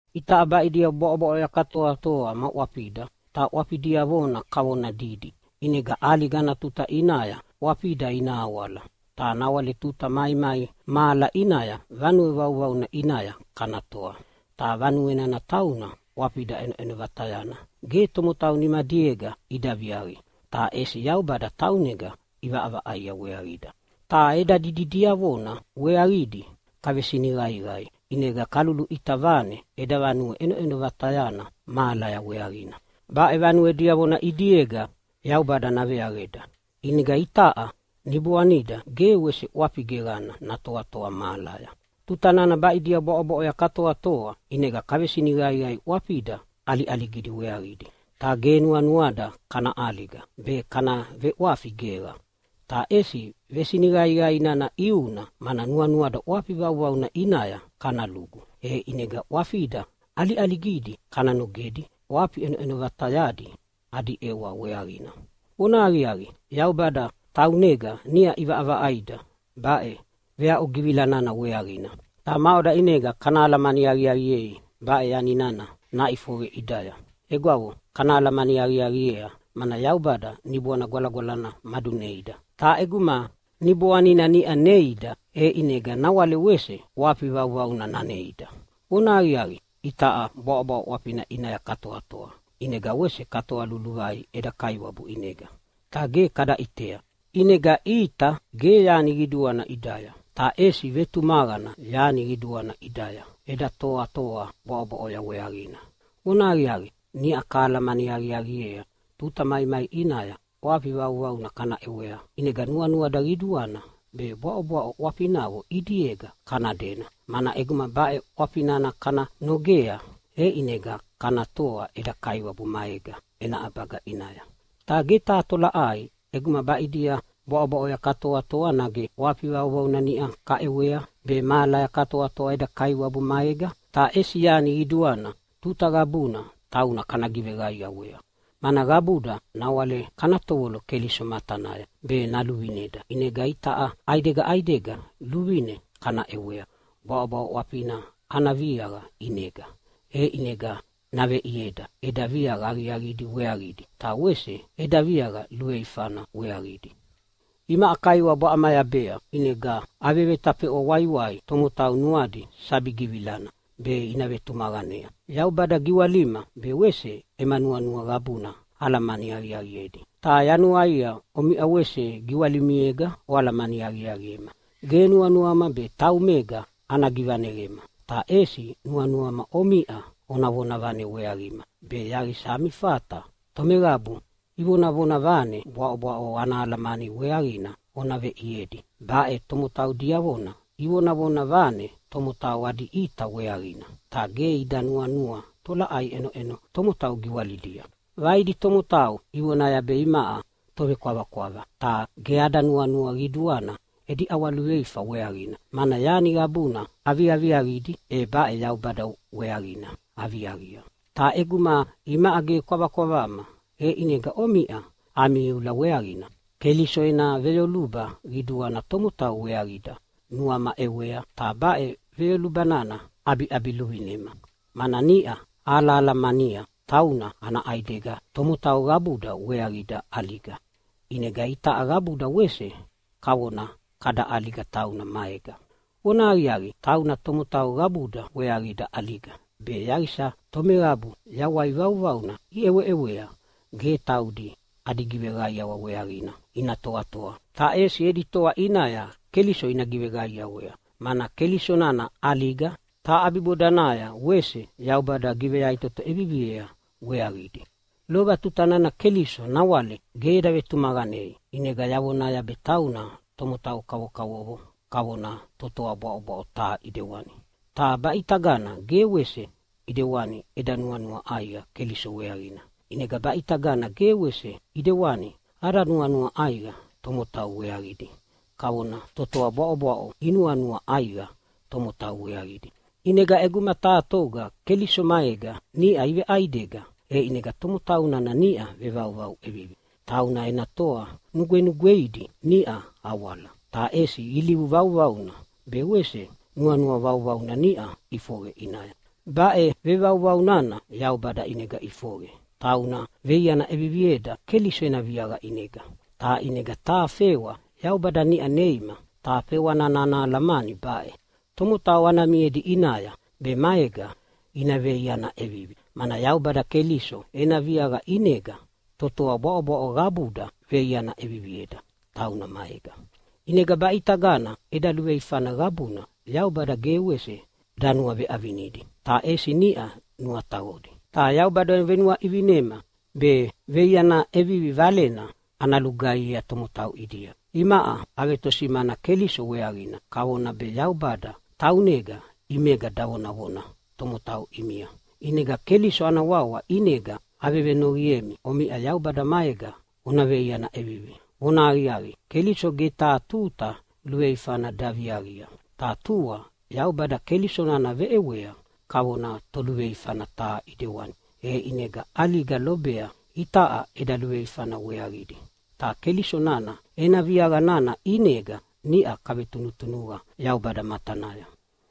Itaʼa baʼidia bwaʼobwaʼoya katoatoa ma ʼwafida, ta ʼwafi diavona kavona didi. ʼInega ʼaliga ana tuta ʼinaya ʼwafida ina awala, ta nawale tuta maimai mahala ʼinaya vanue vauvauna ʼinaya kana toa. Ta vanue nana tauna ʼwafida ʼenoʼeno vatayana ge tomotau nimadiega ida viaqi, ta ʼesi Yaubada taunega ʼivaʼavaʼaia weaqida. Ta eda didi diavona weaqidi kavesiniqaiqai, ʼinega kaluluʼita vane eda vanue ʼenoʼeno vatayana mahalaya weaqina. Baʼe vanue diavona ʼidiega Yaubada naveaqeda. ʼInega itaʼa niboanida ge wese ʼwafi geqana natoatoa mahalaya. Tuta nana baʼidia bwaʼobwaʼoya katoatoa ʼinega kavesiniqaiqai ʼwafida ʼaliʼaligidi weaqidi. Ta ge nuanuada kana ʼaliga be kana veʼwafi geqa, ta ʼesi vesiniqaiqai nana ʼiuna mana nuanuada ʼwafi vauvauna ʼinaya kana lugu, e ʼinega ʼwafida ʼaliʼaligidi kana nogedi ʼwafi ʼenoʼeno vatayadi adi ʼewa weaqina. Vonahaqiaqi, Yaubada taunega niʼa ʼivaʼavaʼaida baʼe veaʼugivila nana weaqina. Ta maʼoda ʼinega kana alamani aqiaqiei baʼe yani nana naʼifoqe ʼidaya? Egwavo, kana alamani aqiaqiea mana Yaubada Niboana Gwalagwalana maduneida. Ta ʼeguma Niboanina niʼa neida, e ʼinega nawale wese ʼwafi vauvauna naneida. Vonahaqiaqi, itaʼa bwaʼobwaʼo ʼwafina ʼinaya katoatoa, ʼinega wese katoa luluvai eda Kaiwabu ʼinega ta ge kada ʼitea. ʼInega ʼita ge yani qiduana ʼidaya, ta ʼesi vetumaqana yani qiduana ʼidaya eda toatoa bwaʼobwaʼoya weaqina. Vonahaqiaqi, niʼa kahalamani aqiaqiea tuta maimai ʼinaya ʼwafi vauvauna kana ʼewedi, ʼinega nuanuada qiduana be bwaʼobwaʼo ʼwafinavo ʼidiega kana dena, mana ʼeguma baʼe ʼwafi nana kana nogea, e ʼinega kana toa eda Kaiwabu maega ena ʼabaga ʼinaya. Ta ge taha tolaʼai ʼeguma baʼidia bwaʼobwaʼoya katoatoa, nage ʼwafi vauvauna niʼa kaʼewea be mahalaya katoatoa eda Kaiwabu maega. Ta ʼesi yani qiduana tuta qabuna tauna kana giveqaiawea, mana qabuda nawale kana tovolo Keliso matanaya be naluvineda. ʼInega itaʼa ʼaidega ʼaidega luvine kana ʼewea bwaʼobwaʼo ʼwafina ana viaqa ʼinega. E ʼinega naveʼieda eda viaqa aqiaqidi weaqidi, ta wese eda viaqa luveifana weaqidi. Imaʼa Kaiwabu aʼamayabea, ʼinega avevetafeʼwa waiwai tomotau nuadi sabi givilana be ina vetumaqanea. Yaubada giwalima be wese ema nuanua qabuna alamani aqiaqiedi, ta yanuaia omiʼa wese giwalimiega oalamani aqiaqiema. Ge nuanuama be taumega ana givaneqema, ta ʼesi nuanuama omiʼa ona vonavane weaqima be yaqisa ami fata tomeqabu ivonavane bwaʼobwaʼo ana alamani weaqina ona veʼiedi. Baʼe tomotau diavona ivonavona vane tomotau adi ʼita weaqina, ta ge ida nuanua tolaʼai ʼenoʼeno tomotau giwalidia. Vaidi tomotau ivonaya be imaʼa tovekwavakwava. Ta ge ada nuanua qiduana edi ʼawaluveifa weaqina, mana yani qabuna aviaviaqidi e baʼe Yaubada weaqina aviaqia. Ta ʼeguma imaʼa ge kwavakwavama, e ʼinega omiʼa ami iula weaqina. Keliso ena veyoluba qiduana tomotau weaqida nuama ʼewea, ta baʼe veyoluba nana ʼabiʼabiluvinema. Mana niʼa ahalamania tauna ana ʼaidega tomotau qabuda weaqida ʼaliga, ʼinega itaʼa qabuda wese kavona kada ʼaliga tauna maega. Vonahaqiaqi, tauna tomotau qabuda weaqida ʼaliga be yaqisa tomeqabu yawai vauvauna iʼeweʼewea ge taudi adi giveqaiawa weaqina ina toatoa, ta ʼesi edi toa ʼinaya Keliso ina giveqaiawea, mana Keliso nana ʼaliga, ta ʼabibodanaya wese Yaubada giveyaʼitoto ʼeviviea weaqidi. Lova tuta nana Keliso nawale ge eda vetumaqanei ʼinega yavonaya be tauna tomotau kavokavovo kavona totoa bwaʼobwaʼo taha ʼidewani. Ta baʼitagana ge wese ʼidewani eda nuanua ʼaiqa Keliso weaqina. ʼInega baʼitagana ge wese ʼidewani ada nuanua ʼaiqa tomotau weaqidi kavona totoa bwaʼobwaʼo inuanua ʼaiqa tomotau weaqidi. ʼInega ʼeguma taha toga Keliso maega niʼa iveʼaidega, e ʼinega tomotau nana niʼa vevauvau ʼevivi. Tauna ena toa nugwenugweidi niʼa awala, ta ʼesi ilivu vauvauna be wese nuanua vauvauna niʼa iʼifoqe ʼinaya. Baʼe vevauvau nana Yaubada ʼinega ʼifoqe. Tauna veiana ʼevivieda Keliso ena viaqa ʼinega. Ta ʼinega taha fewa Yaubada niʼa neima, ta fewa nana ana alamani baʼe: Tomotau ana miedi ʼinaya be maega ina veiaiana ʼevivi. Mana Yaubada Keliso ena viaqa ʼinega totoa bwaʼobwaʼo qabuda veiana ʼevivieda tauna maega. ʼInega baʼitagana eda luveifana qabuna Yaubada ge wese danuaveʼavinidi, ta ʼesi niʼa nuataqodi. Ta Yaubada venuaʼivinema be veiaiana ʼevivi Valena ana lugaihiea tomotau ʼidia. Imaʼa avetosimana Keliso weaqina, kavona be Yaubada taunega ʼimega davonavona tomotau ʼimia. ʼInega Keliso ana wawa ʼinega avevenoqiemi omiʼa Yaubada maega ona veiaiana ʼevivi! Vonahaqiaqi, Keliso ge taha tuta luveifana daviaqia. Ta tua Yaubada Keliso nana veʼewea kavona toluveifana taha ʼidewani, e ʼinega ʼaliga lobea itaʼa eda luveifana weaqidi. Ta Keliso nana ena viaqa nana ʼinega niʼa kavetunutunuqa Yaubada matanaya.